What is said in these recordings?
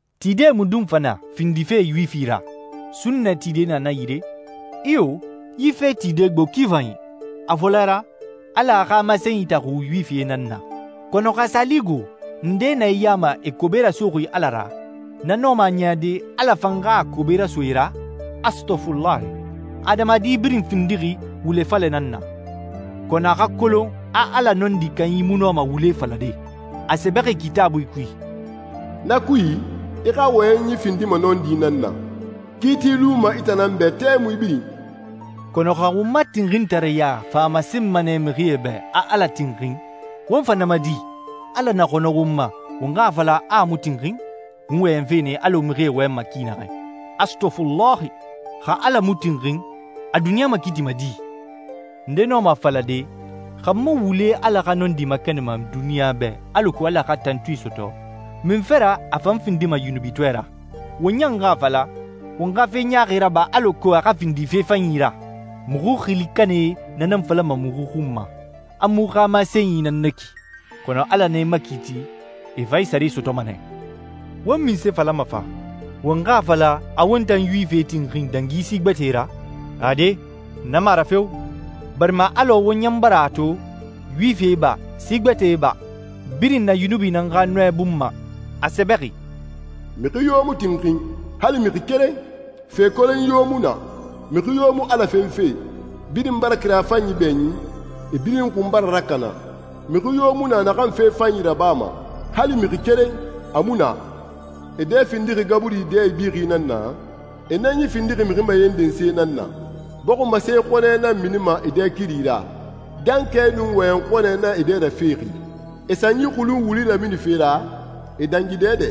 Tide mundun fa na findife Yuwifi ra? Sunnɛ tide na na yire? Iyo, yi fee tide gbo ki fanyi. A fɔlɛ ra, Ala a xa masenyi taxu Yuwifie nan na. Kɔnɔ xa a sa li go, ndee na e ya ma e kobe rasoxi Ala ra, na nɔma a niyade Ala fan xa a kobe raso e ra? Astɔfulahi. Adamadi birin findixi wule falɛ nan na, kɔnɔ a xa kolon a Ala nɔndi kanyi mu nɔma wule falade. A sɛbɛxi Kitaabui kui: «Na kui, i xa wɔyɛnyi findima nɔndi nan na. Kiiti luma i tan nan bɛ tɛmui birin.» Kɔnɔ xa won ma tinxintareya fa a masenma nɛ mixie bɛ a Ala tinxin, won fa na ma di? Ala na xɔnɔ won ma, won xa a fala a mu tinxin? (N wɔyɛnfe nɛ alɔ mixie wɔyɛnma ki naxɛ.) Astɔfulahi! Xa Ala mu tinxin, a duniɲa makiitima di? Nde nɔma a falade, «Xa n ma wule Ala xa nɔndi makɛnɛnma duniɲa bɛ alako Ala xa tantui sɔtɔ, munfe ra a fa n findima yunubitɔɛ ra?» Won ɲan xa a fala, «Won xa fe ɲaaxi raba alako a xa sa findi fe fanyi ra.» Muxu xili kanɛe na nan falama muxu xun ma, a muxu xa masenyi nan na ki. Kɔnɔ Ala na e makiiti, e fan e sare sɔtɔma nɛ. Won munse falama fa? Won xa a fala a won tan Yuwifie tinxin dangi si gbɛtɛe ra? Ade, na mu a ra feo, barima alɔ won ɲan bara a to, Yuwifie ba, si gbɛtɛe ba, birin na yunubi nan xa nɔɛ bun ma. A sɛbɛxi: «Mixi yo mu tinxin, hali mixi keren. Fe kolonyi yo mu na, mixi yo mu Ala fenfe. Birin bara kira fanyi bɛɲin, e birin xun bara rakana. Mixi yo mu na naxan fe fanyi rabama, hali mixi keren, a mu na. E dɛ findixi gaburi dɛ ibixi nan na, e nɛnyi findixi mixi mayenden se nan na. Bɔximase xɔnɛ nan minima e dɛ kiri ra, dankɛ nun wɔyɛn xɔnɛ nan e dɛ rafexi. E sanyi xulun wuli raminife ra, e dangi dɛdɛ,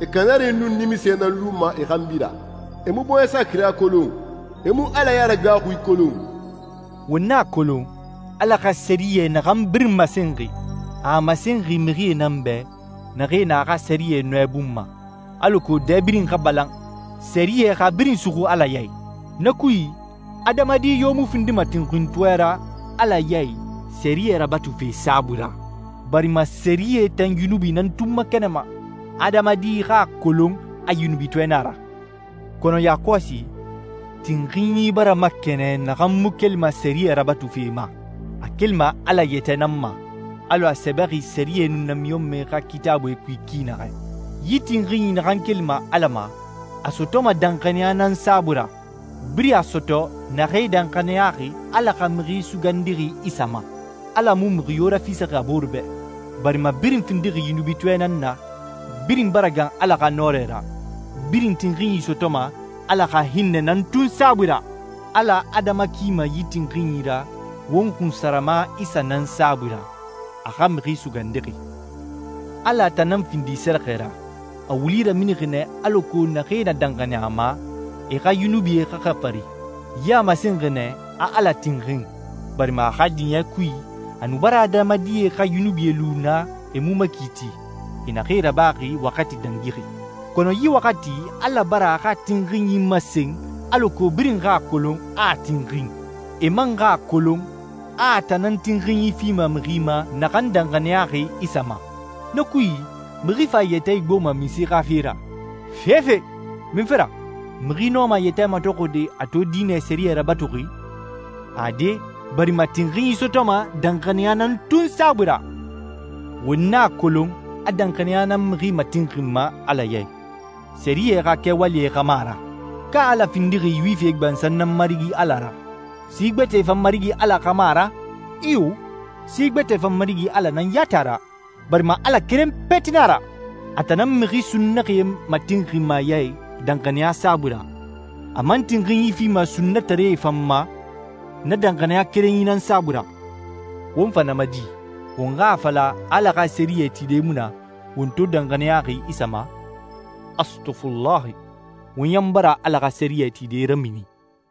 e kanari nun nimisɛ nan luma e xanbi ra. E mu bɔɲɛsa kira kolon, e mu Ala yaragaaxui kolon.» Won a kolon Ala xa sɛriyɛ naxan birin masenxi, a a masenxi mixie nan bɛ naxee na a xa sɛriyɛ nɔɛ bun ma, alako dɛ birin xa balan, sɛriyɛ xa birin suxu Ala ya i. Na kui, adamadi yo mu findima tinxintɔɛ ra Ala ya i sɛriyɛ rabatufe saabui ra, barima sɛriyɛ tan yunubi nan tun makɛnɛnma, adamadi xa a kolon a yunubitɔɛ na a ra. Kɔnɔ yakɔsi, tinxinyi bara makɛnɛn naxan mu kelima sɛriyɛ rabatufe ma. A kelima Ala yɛtɛ nan ma, alɔ a sɛbɛxi sɛriyɛ nun namiɲɔnmɛe xa Kitaabuie kui ki naxɛ. Yi tinxinyi naxan kelima Ala ma a sɔtɔma danxaniya nan saabui ra, birin a sɔtɔ naxee danxaniyaxi Ala xa Mixi Sugandixi Isa ma. Ala mu mixi yo rafisaxi a boore bɛ, barima birin findixi yunubitɔɛ nan na, birin bara gan Ala xa nɔrɛ ra, birin tinxinyi sɔtɔma Ala xa hinnɛ nan tun saabui ra. Ala adama kima yi tinxinyi ra won xunsarama Isa nan saabui ra, a xa Mixi Sugandixi. Ala a tan nan findi sɛrɛxɛ ra, a wuli raminixi nɛ alako naxee na danxaniya a ma, e xa yunubie xa xafari. Yi a masenxi nɛ a Ala tinxin, barima a xa diɲɛ kui, a nu bara adamadie xa yunubie lu na e mu makiiti, e naxee rabaxi waxati dangixi. Kɔnɔ yi waxati Ala bara a xa tinxinyi masen alako birin xa a kolon a a tinxin, e man xa a kolon a a tan nan tinxinyi fima mixi ma naxan danxaniyaxi Isa ma. Na kui, mixi fa a yɛtɛ igboma munse xa fe ra? Fefe! Munfe ra? Mixi nɔma a yɛtɛ matɔxɔde a to diinɛ sɛriyɛ rabatuxi? Ade, barima tinxinyi sɔtɔma danxaniya nan tun saabui ra. Won a kolon a danxaniya nan mixi matinxinma Ala ya i, sɛriyɛ xa kɛwalie xa mu a ra. Ka Ala findixi Yuwifie gbansan nan Marigi Ala ra? Si gbɛtɛe fan Marigi Ala xa mu a ra? Iyo, si gbɛtɛe fan Marigi Ala nan yati a ra, barima Ala keren peti na a ra. A tan nan mixi sunnaxie matinxinma a ya i danxaniya saabui ra, a man tinxinyi fima sunnataree fan ma na danxaniya kerenyi nan saabui ra. Won fa na ma di? Won xa a fala a Ala xa sɛriyɛ tide mu na won to danxaniyaxi Isa ma? Astɔfulahi! Won ɲan bara Ala xa sɛriyɛ tide ramini.